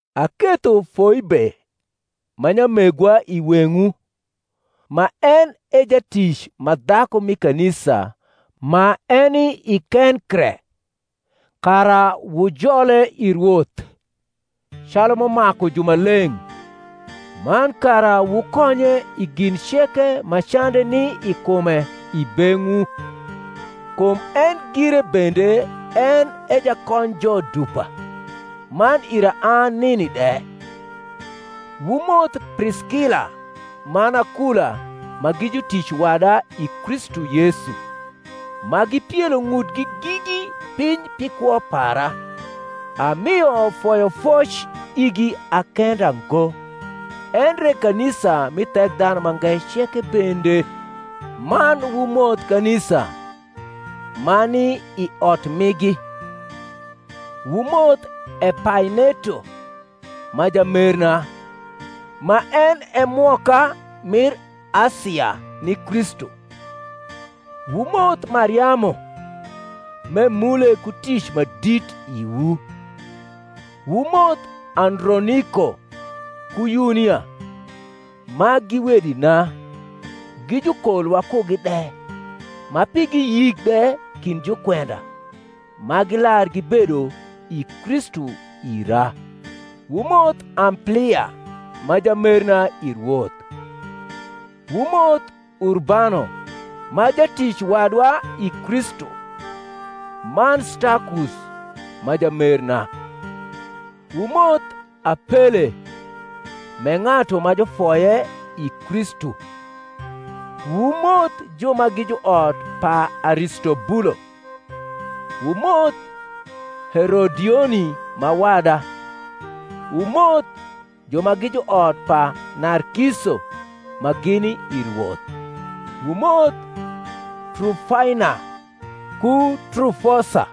Aketho Foibe ma nyamegwa i weng’wu, ma en e jatic ma dhaku mi kanisa ma eni i Kenkre: kara wujole i Rwoth, calu m’umaku jumaleng’, man kara wukonye i gin ceke ma cande ni i kume i beng’wu: kum en gire bende en e jakonyjo dupa, man ira an nini de. Wumoth Priskila man Akula ma gi jutic wada i Kristu Yesu, ma gipielo ng’utgi gigi piny pi kwo para; amio foyofoc igi a kenda ngo, endre kanisa mi Thekdhanumange ceke bende: man wumoth kanisa ma ni i ot migi. Wumoth Epaineto ma jamerna, ma en e mwoka mir Asia ni Kristu. Wumoth Mariamu, m’emule ku tic ma dit iwu. Wumoth Androniko ku Yunia, ma gi wedina, gi jukol wakugi de, ma pigi yik de kind jukwenda, ma gilar gibedo i Kristu ira. Wumoth Amplia ma jamerna i Rwoth. Wumoth Urbano ma jatic wadwa i Kristu, man Stakus ma jamerna. Wumoth Apele m’e ng’atu ma jufoye I Kristu. Wumoth ju ma gi juot pa Aristobulo. Wumoth Herodioni ma wada. Wumoth ju ma gi juot pa Narkiso, ma gini i Rwoth. Wumoth Trufaina ku Trufosa,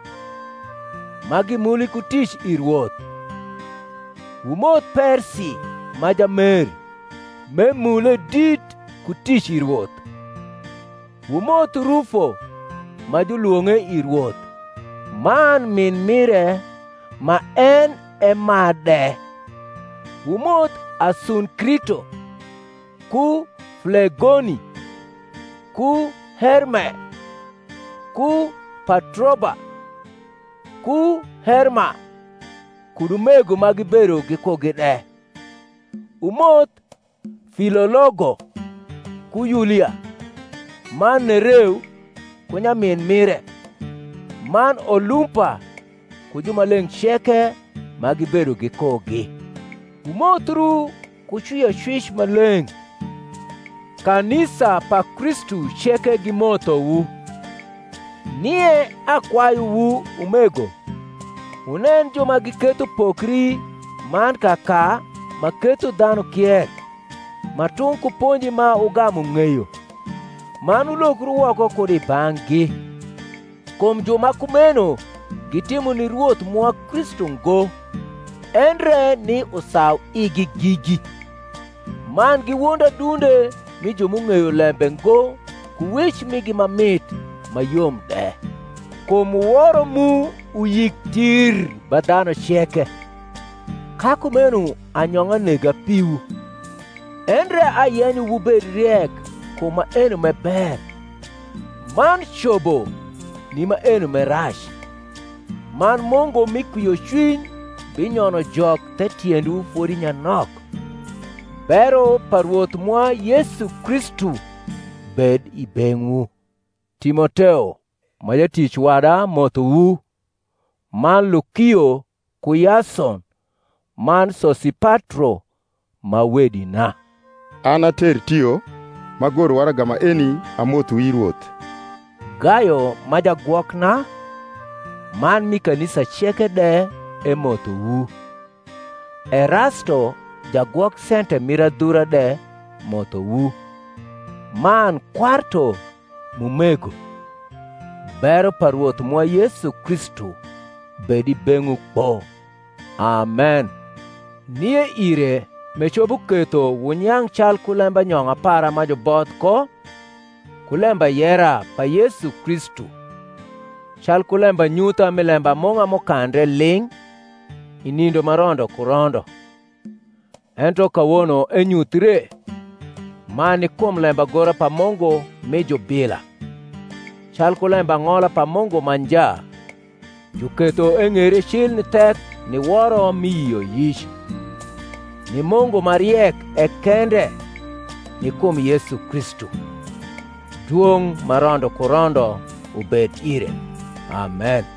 ma gimuli ku tic i Rwoth. Wumoth Persi ma jamer, m’emule dit ku tic i Rwoth. Wumoth Rufo ma julwong’e i Rwoth, man min mire ma en e ma de. Wumoth Asunkrito, ku Flegoni, ku Herme, ku Patroba, ku Herma, kud umego ma gibedo gikugi de. Wumoth Filologo ku Yulia, man Nereu ku nyamin mire, man Olumpa ku jumaleng’ ceke ma gibedo gikugi. Wumothru ku cwiocwic ma leng’. Kanisa pa Kristu ceke gimothowu. Nie akwayuwu, umego, wunen ju ma giketho pokri man kaka ma ketho dhanu kier, ma tung’ ku ponji ma wugamu ng’eyo: man wulokru woko kud i bang’gi. Kum ju ma kumeno gitimo ni Rwoth mwa Kristu ngo, endre ni usauigi gigi: man giwondo adunde mi ju m’ung’eyo lembe ngo ku wec migi ma mit ma yom de. Kum woro mu uyik tir ba dhanu ceke. Ka kumeno anyong’a nega piwu: endre ayenyo wubed riek kum maeno m’e ber, man cobo ni maeni m’e rac. Man Mungu mi kwiocwiny binyono Jok the tiendwu fodi nyanok. Bero pa Rwoth mwa Yesu Kristu bed i beng’wu. Timoteo ma jatic wada mothowu; man Lukio ku Yason, man Sosipatro, ma wedina. An a Tertio, m’agoro waraga maeni, amothowu i Rwoth. Gayo ma jagwokna, man mi kanisa ceke de emothowu. Erasto jagwok sente mir adhura de mothowu, man Kwarto m’umego. Bero pa Rwoth mwa Yesu Kristu bed i beng’wu kpo. Amen. Nie ire m’ecopo ketho wunyang’ calku lembanyong’a para ma juboth ko ku lembayera pa Yesu Kristu, calku lembanyutha mi lembamung’a m’ukandre ling’ i nindo ma rondo ku rondo, ento kawono enyuthie, man ni kum lembagora pa Mungu mi jubila, calku lembang’ola pa Mungu ma nja, juketho eng’eire cil ni thek ni woro mi yioyic: ni Mungu ma riek e kende, ni kum Yesu Kristu, dwong’ ma rondo ku rondo ubed ire. Amen.